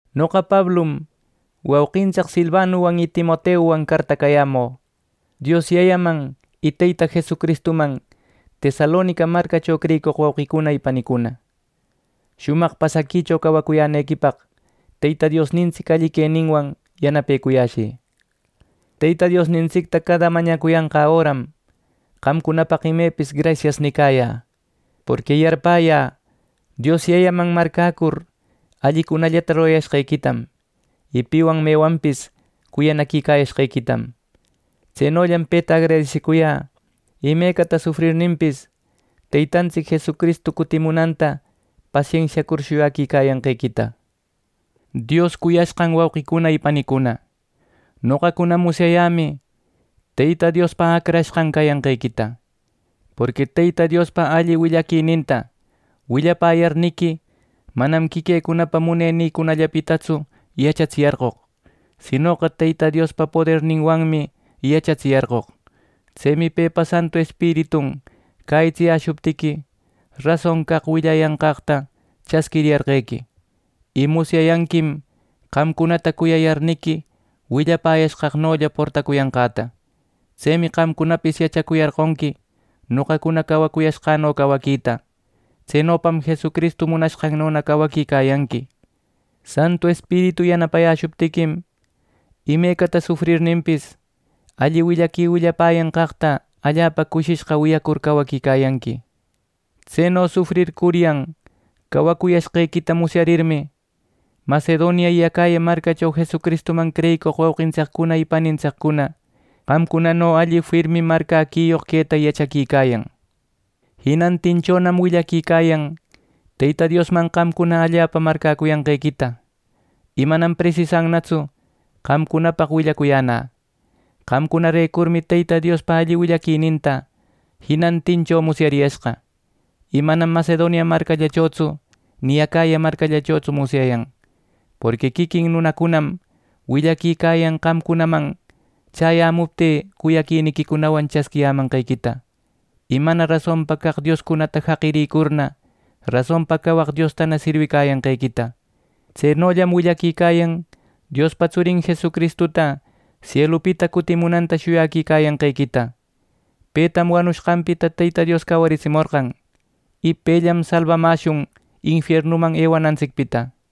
Noqa Pablum wauqintsic Silvanuwan y Timoteuwan cartacayämü, Dios Yayaman y Teyta Jesucristuman Tesalonica marcacho creyicoq wauqicuna y panicuna. Shumaq pasaquicho cawacuyänequipaq Teyta Diosnintsic alli queninwan yanapecuyäshï. Teyta Diosnintsicta cada mañacuyanqä öram qamcunapaq imepis “Grasias” nicayä, porqui yarpäyä Dios Yayaman marcäcur, allicunallata rurashqequitam y piwan mewanpis cuyanaquicayashqequitam. Tsenollam peta agradesicuyä imecata sufrirninpis, Teytantsic Jesucristu cutimunanta pasensiacur shuyaquicayanqequita. Diospa cuyashqan wauqicuna y panicuna, noqacuna musyayämi Teyta Diospa acrashqan cayanqequita. Porqui Teyta Diospa alli willaquininta willapäyarniqui manam quiquïcunapa munenïcunallapitatsu yachatsiyarqoq; sinoqa Teyta Diospa poderninwanmi yachatsiyarqoq. Tsemi pepa Santu Espiritun cäyitsiyäshuptiqui, rason caq willapäyanqaqta chasquiriyarqequi. Y musyayanquim qamcunata cuyayarniqui willapäcuyashqänolla portacuyashqäta. Tsemi qamcunapis yachacuyarqonqui noqacuna cawayashqäno cawaquita; tsenopam Jesucristu munashqannona cawaquicayanqui. Santu Espiritu yanapayäshuptiquim imecata sufrirninpis, alli willaqui willapäyanqaqta allapa cushishqa wiyacur cawaquicayanqui. Tseno sufrircuryan cawacuyashqequita musyarirmi, Macedonia y Acaya marcacho Jesucristuman creyicoq wauqintsiccuna y panintsiccuna qamcunano alli firmi marcäquiyoq queta yachaquicayan. Jinantinchonam willaquicayan Teyta Diosman qamcuna allapa marcäcuyanqequita y manam presisannatsu qamcunapaq willacuyänä. Qamcunarecurmi Teyta Jesuspa alli willaquininta jinantincho musyariyashqa, y manam Macedonia marcallachotsu ni Acaya marcallachotsu musyayan. Porqui quiquin nunacunam willaquicayan qamcunaman chäyämuptï cuyaquiniquicunawan chasquiyämanqequita, y mana rasonpa caq dioscunata jaqirïcurna, rasonpa cawaq Diostana sirwicayanqequita. Tsenollam willaquicayan Diospa Tsurin Jesucristuta sielupita cutimunanta shuyaquicayanqequita. Petam wanushqanpita Teyta Dios cawaritsimorqan, y pellam salbamäshun infiernuman ewanantsicpita.